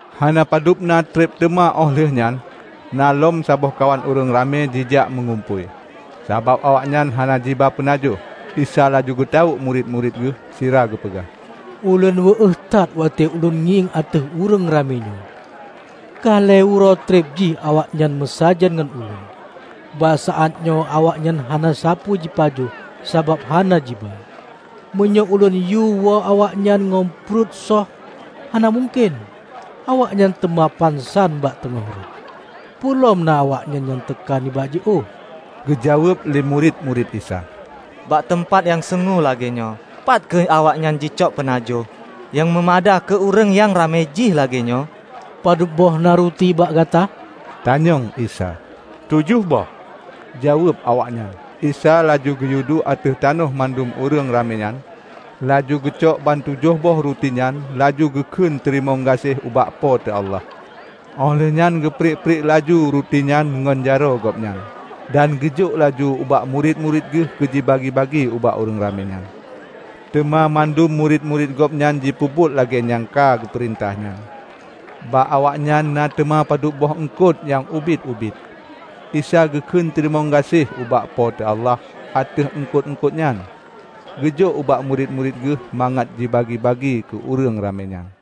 Hana padubna treb teuma óh lheueh nyan, na lom saboh kawan ureuëng ramé jijak meugumpôi. Sabab awaknyan hana jiba peunajoh, Isa laju geutawök murit-murit Geuh sira geupeugah, "Ulôn wéueh that watée Ulôn ngieng ateueh ureuëng ramé nyoe. Ka lhée uroe treb jih awaknyan meusajan ngon Ulôn, bak saát nyoe awaknyan hana sapeue jipajoh sabab hana jiba. Meunyoe ulôn yue woe awaknyan ngon pruet söh hana mungken, awaknyan teuma pansan bak teungoh rot. Peue lom na awaknyan nyang teuka nibak jiôh." Geujaweueb lé murit-murit Isa, "Bak teumpat nyang sungue lagée nyoe, pat kheueh awaknyan jicok peunajoh nyang meumada keu ureuëng nyang ramé jih lagée nyoe?" "Padubboh na ruti bak gata?" tanyong Isa. "Tujoh boh," jaweueb awaknyan. Isa laju geuyueduek ateueh tanoh mandum ureuëng ramé nyan, laju geucok bantujoh boh ruti nyan laju geu kheun teurimong gaséh ubak Po teu Allah. Óh lheueh nyan geurpriek-priek laju rutinyan ngon jaroe Gobnyan dan geujok laju ubak murit-murit Geuh keu jibagi-bagi ubak ureuëng ramé nyan. Teuma mandum murit-murit Gobnyan jipeubuet lagée nyang ka geupeurintah nyan. Bak awaknyan na teuma padub boh eungkot nyang ubit-ubit. Isa geukheun teurimong gaséh ubak Po teu Allah ateueh eungkot-eungkot nyan, geujok ubak murit-murit Geuh mangat jibagi-bagi keu ureuëng ramé nyan.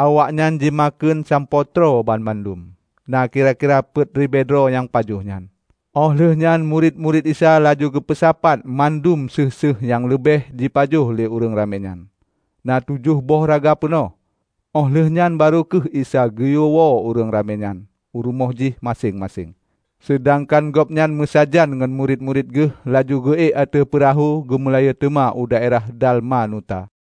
Awaknyan jimakheun sampoe troe banmandum -- na kira-kira peuet ribée droe nyang pajoh nyan. Óh lheueh nyan murit-murit Isa laju geupeusapat mandum séueh-séueh nyang leubeh jipajoh lé ureuëng ramé nyan -- na tujoh boh raga peunoh. Óh lheueh nyan barô kheueh Isa geuyue woe ureuëng ramé nyan u rumoh jih maséng-maséng, seudangkan Gobnyan meusajan ngon murit-murit Geuh laju geu ék ateueh peurahô geumeulayeue teuma u daerah Dalmanuta.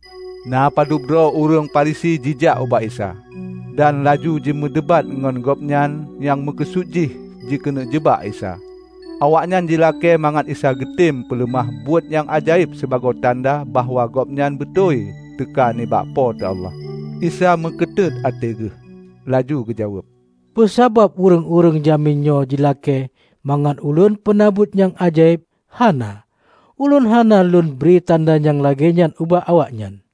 Na padub droe ureuëng Farisi jijak ubak Isa, dan laju jimeudebat ngon Gobnyan nyang meukeusut jih jikeuneuk jeubak Isa. Awaknyan jilakée mangat Isa beugeutem peuleumah buet nyang ajaéb sibagoe tanda bahwa gobnyan beutôi teuka nibak Po teu Allah. Isa meukeutuët até Geuh laju geujaweueb, "Peue sabab ureuëng-ureuëng jamén nyoe jilakée mangat lôn peuna buet nyang ajaéb? Hana! Ulôn hana lôn bri tanda nyang lagée nyan ubak awaknyan!"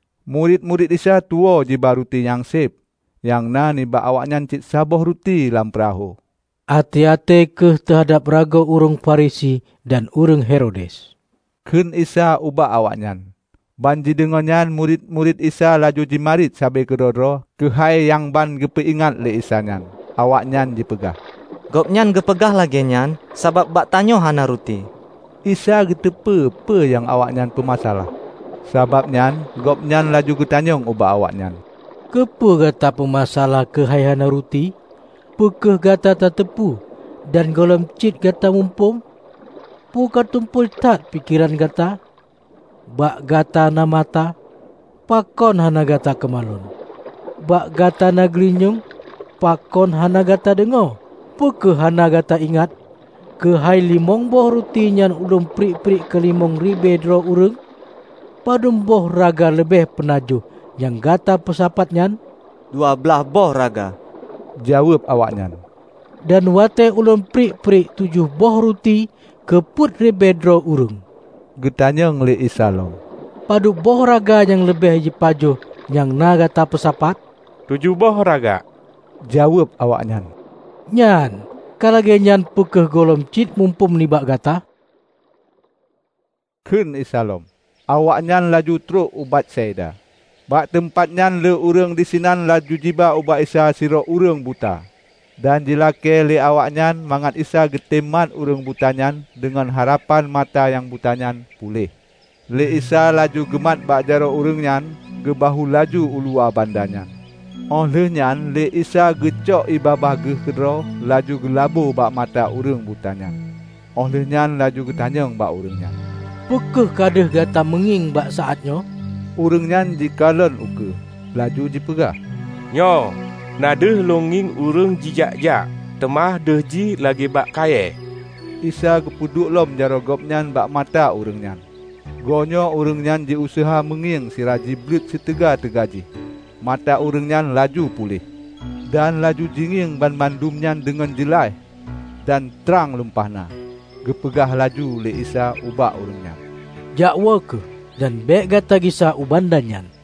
Murit-murit Isa tuwoe jiba ruti nyang séb. Nyang na bak awaknyan cit saboh ruti lam peurahô. "Até-até kheueh teuhadab ragoe ureuëng Farisi dan ureuëng Herodes," kheun Isa ubak awaknyan. Ban jideungoe nyan murit-murit Isa laju jimarit sabe keudroe-droe keuhai nyang ban geupeuingat lé Isa nyan. Awaknyan jipeugah, "Gobnyan geupeugah lagée nyan, sabab bak tanyoe hana ruti." Isa geuteupeue peue nyang awaknyan peumasa alah. Sabab nyan Gobnyan laju geutanyong ubak awaknyan, "Keupeue gata peumasa alah keuhai hana ruti? Peu kheueh gata tateupeue dan gohlom cit gata muphom? Peue ka tumpôi that pikeran gata? Bak gata na mata -- pakon hana gata keumalon? Bak gata na geulinyueng -- pakon hana gata deungoe? Peu kheueh hana gata ingat keuhai limong boh ruti nyan ulôn priek-priek keu limong ribée droe ureuëng? Padub boh raga leubeh peunajoh nyang gata peusapat nyan?" "Dua blaih boh raga," jaweueb awaknyan. "Dan watée ulôn priek-priek tujoh boh ruti keu peuet ribée droe ureuëng," geutanyong lé Isa lom, "Padub boh raga nyang leubeh jipajoh nyang na gata peusapat?" "Tujoh boh raga," jaweueb awaknyan. "Nyan, ka lagée nyan peu kheueh gohlom cit muphom nibak gata?" kheun Isa lom. Awaknyan laju troh u Betsaida. Bak teumpat nyan lé ureuëng disinan laju jiba ubak Isa sidroe ureuëng buta, dan jilakée lé awaknyan mangat Isa geutem mat ureuëng buta nyan deungon harapan mata nyang buta nyan puléh. Lé Isa laju geumat bak jaroe ureuëng nyan geubahue laju u luwa banda nyan. Óh lheueh nyan lé Isa geucok ié babah Geuh keudroe laju geulabô bak mata ureuëng buta nyan, óh lheueh nyan laju geutanyong bak ureuëng nyan, "Peu kheueh ka deuh gata meungieng bak saát nyoe?" Ureuëng nyan jikalon ukeue, laju jipeugah, "Nyoe. Na deuh lôn ngieng ureuëng jijak-jak; teuma deuh jih lagée bak kayée." Isa geupeuduek lom jaroe Gobnyan bak mata ureuëng nyan. Goenyoe ureuëng nyan jiuseuha jimeungieng sira jibleuet siteuga-teuga jih. Mata ureuëng nyan laju puléh, dan laju jingieng banmandum nyan deungon jeulaih dan trang lumpah na. Geupeugah laju lé Isa ubak ureuëng nyan, "Jakwoe kheueh, dan bék gata gisa u banda nyan."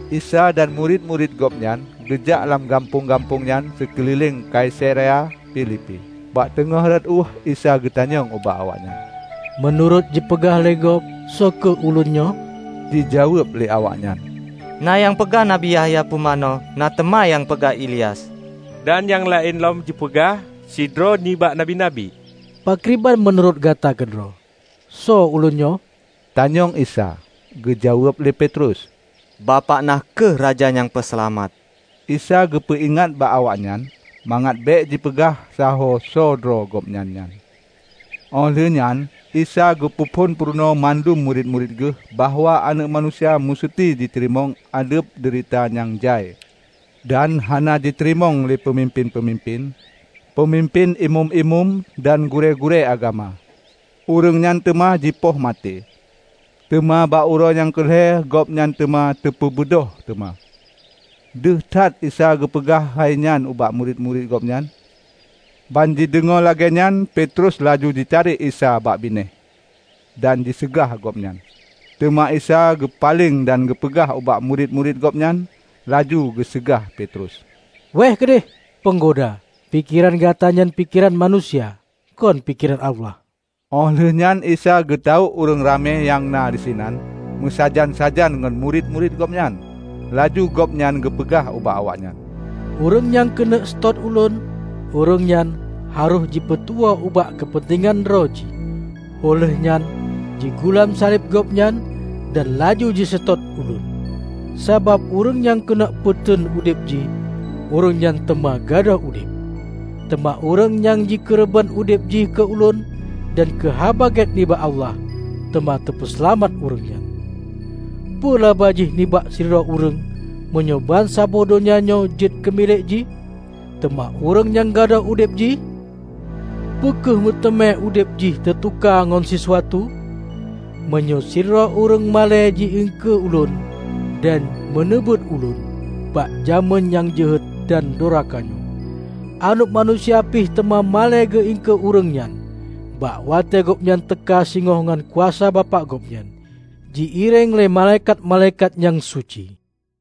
Isa dan murit-murit gobnyan geujak lam gampông-gampông nyan sikeulileng Kaisarea Filipi. Bak teungoh rot ueh Isa geutanyong ubak awaknyan, "Meunurot jipeugah lé gob, soe kheueh Ulôn nyoe?" Jijaweueb lé awaknyan, "Na nyang peugah, Nabi Yahya Pumanö; na teuma nyang peugah Ilyas, dan nyang laén lom jipeugah: sidroe nibak nabi-nabi." "Pakriban meunurot gata keudroe, soe Ulôn nyoe?" tanyong Isa. Geujaweueb lé Petrus, "Bapak na kheueh Raja Nyang Peuseulamat!" Isa geupeuingat bak awaknyan, mangat bék jipeugah sahoe soe droe Gobnyan nyan. Óh lheueh nyan, Isa geupeu phon peurunoe mandum murit-murit Geuh bahwa Aneuëk Manusia museuti jiteurimong ázeb deurita nyang jai, dan hana jiteurimong lé peumimpén-peumimpén, Peumimpén Imeum-imeum dan gurée-gurée agama. Ureuëng nyan teuma jipoh maté, teuma bak uroe nyang keu lhée Gobnyan teuma teupeubeudôh teuma. Deuh that Isa geupeugah hainyan ubak murit-murit Gobnyan. Ban jideungoe lagée nyan Petrus laju jitarek Isa bak binéh, dan jiseugah Gobnyan. Teuma Isa geupaleng dan geupeugah ubak murit-murit Gobnyan, laju geuseugah Petrus, "Wéeh keudeh, Peunggoda! Pikeran gata nyan pikeran manusia; kon pikeran Allah!" Óh lheueh nyan Isa geutawök ureuëng ramé nyang na disinan meusajan-sajan ngon murit-murit Gobnyan. Laju Gobnyan geupeugah ubak awaknyan, "Ureuëng nyang keuneuk seutôt Ulôn, ureuëng nyan harôh jipeutuwoe ubak keupeuntengan droe jih, óh lheueh nyan jigulam saleb gobnyan, dan laju jiseutôt Ulôn. Sabab ureuëng nyang keuneuk peuteun udeb jih, ureuëng nyan teuma gadôh udeb. Teuma ureuëng nyang jikeureubeuen udeb jih keu Ulôn dan keu Haba Gét nibak Allah, teuma teupeuseulamat ureuëng nyan. Peue laba jih nibak sidroe ureuëng, meunyoe bansaboh donya nyoe jeuet keumilék jih, teuma ureuëng nyan gadôh udeb jih? Peu kheueh meuteumé udeb jih teutuka ngon sisuatu? Meunyoe sidroe ureuëng malée jiangkée Ulôn dan meuneubeuet Ulôn bak jamén nyang jeuhet dan doraka nyoe, Aneuëk Manusia pih teuma malée geuangkée ureuëng nyan, bak watée Gobnyan teuka singoh ngon kuasa Bapak Gobnyan, ji-iréng lé malaikat-malaikat nyang suci."